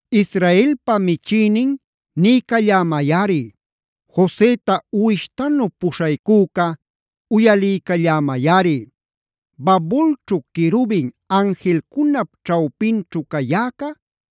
Israelpa michïnin, niycallämayꞌari. Joseta uwishtanu puśhaycüca, uyaliycallämayꞌari. Babulćhu querubin anjilcunap ćhawpinćhu cayäca,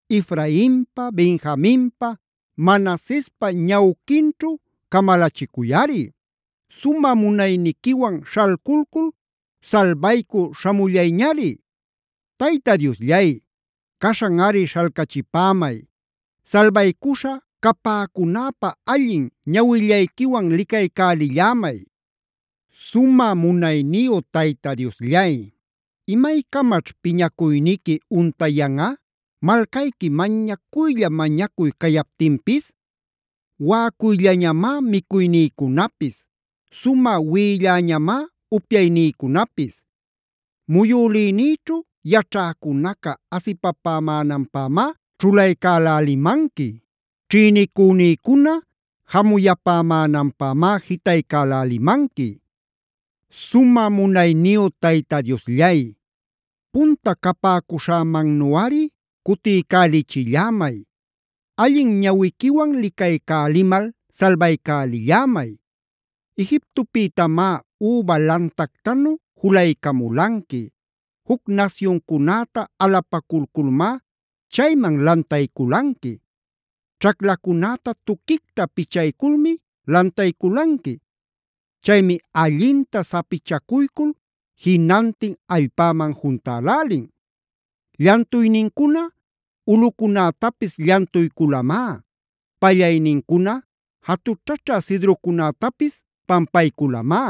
Efrainpa, Benjaminpa, Manasespa ñawquinćhu camalachicuyꞌari. Sumä munayniquiwan śhalculcul salbaycü śhamullayñari. Tayta Diosllay, ¡caśhanꞌari śhalcachipämay! Salbaycuśha capäcunäpä allin ñawillayquiwan licaycälillämay. Sumä munayniyu Tayta Diosllay, ¿imaycamaćh piñacuyniqui untayanꞌa, malcayqui mañacuylla-mañacuy cayaptinpis? Waꞌacuylläñamá micuynïcunapis. Sumä wiꞌilläñamá upyaynïcunapis. Muyülïnïćhu yaćhäcunaca asipapämänanpämá ćhulaycälälimanqui. Ćhïnicünïcuna jamuyapämänanpämá jitaycälälimanqui. Sumä munayniyu Tayta Diosllay, punta capäcuśhämannuꞌari cutiycälichillämay. Allin ñawiquiwan licaycälimal salbaycälillämay. Egiptopïtamá üba lantactanu julaycamulanqui. Juc nasyuncunäta alapaculculmá chayman lantayculanqui. Ćhaclacunäta tuquicta pichayculmi lantayculanqui. Chaymi allinta sapichacuycul jinantin allpäman juntälälin. Llantuynincuna ulꞌucunätapis llantuyculamá. Pallaynincuna jatućhaćha cedrocunätapis pampayculamá.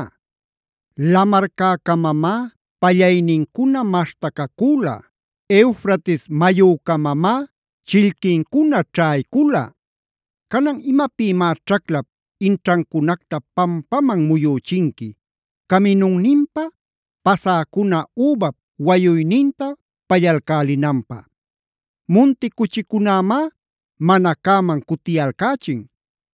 Lamarcäcamamá pallaynincuna maśhtacacüla. Eufrates mayücamamá chillquincuna ćhaycula. Canan, ¿imapïmá ćhaclap inćhancunacta pampaman muyüchinqui, caminunninpa pasäcuna übap wayuyninta pallalcälinanpä? Munti cuchicunämá mana cäman cutiyalcächin.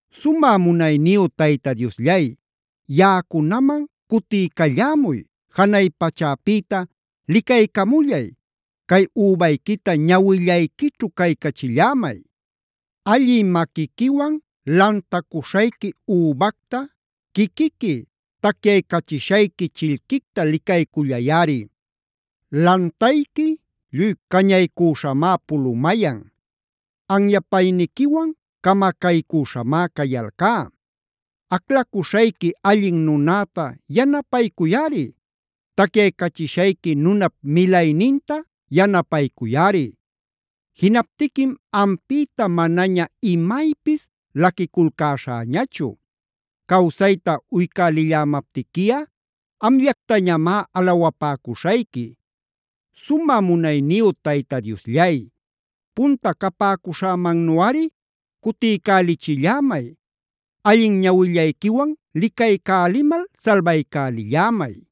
Sumä munayniyu Tayta Diosllay, yaꞌacunaman cutiycallämuy. Janay pachäpïta licaycamullay. Cay übayquita ñawillayquićhu caycachillämay. Allï maquiquiwan lantacuśhayqui übacta, quiquiqui tacyaycachishayqui chillquicta licaycullayꞌari. ¡Lantayqui lluy cañaycüśhamá pulumayan! ¡Anyapayniquiwan camacaycüśhamá cayalcá! Aclaycuśhayqui allin nunäta yanapaycuyꞌari. Tacyaycachishayqui nunap milayninta yanapaycuyꞌari. Jinaptiquim ampïta manaña imaypis laquiculcäśhäñachu. Cawsayta uycälillämaptiquiꞌa amllactañamá alawapäcuśhayqui. Sumä munayniyu Tayta Diosllay, punta capäcuśhämannuꞌari cutiycälichillämay. Allin ñawillayquiwan licaycälimal salbaycälillämay.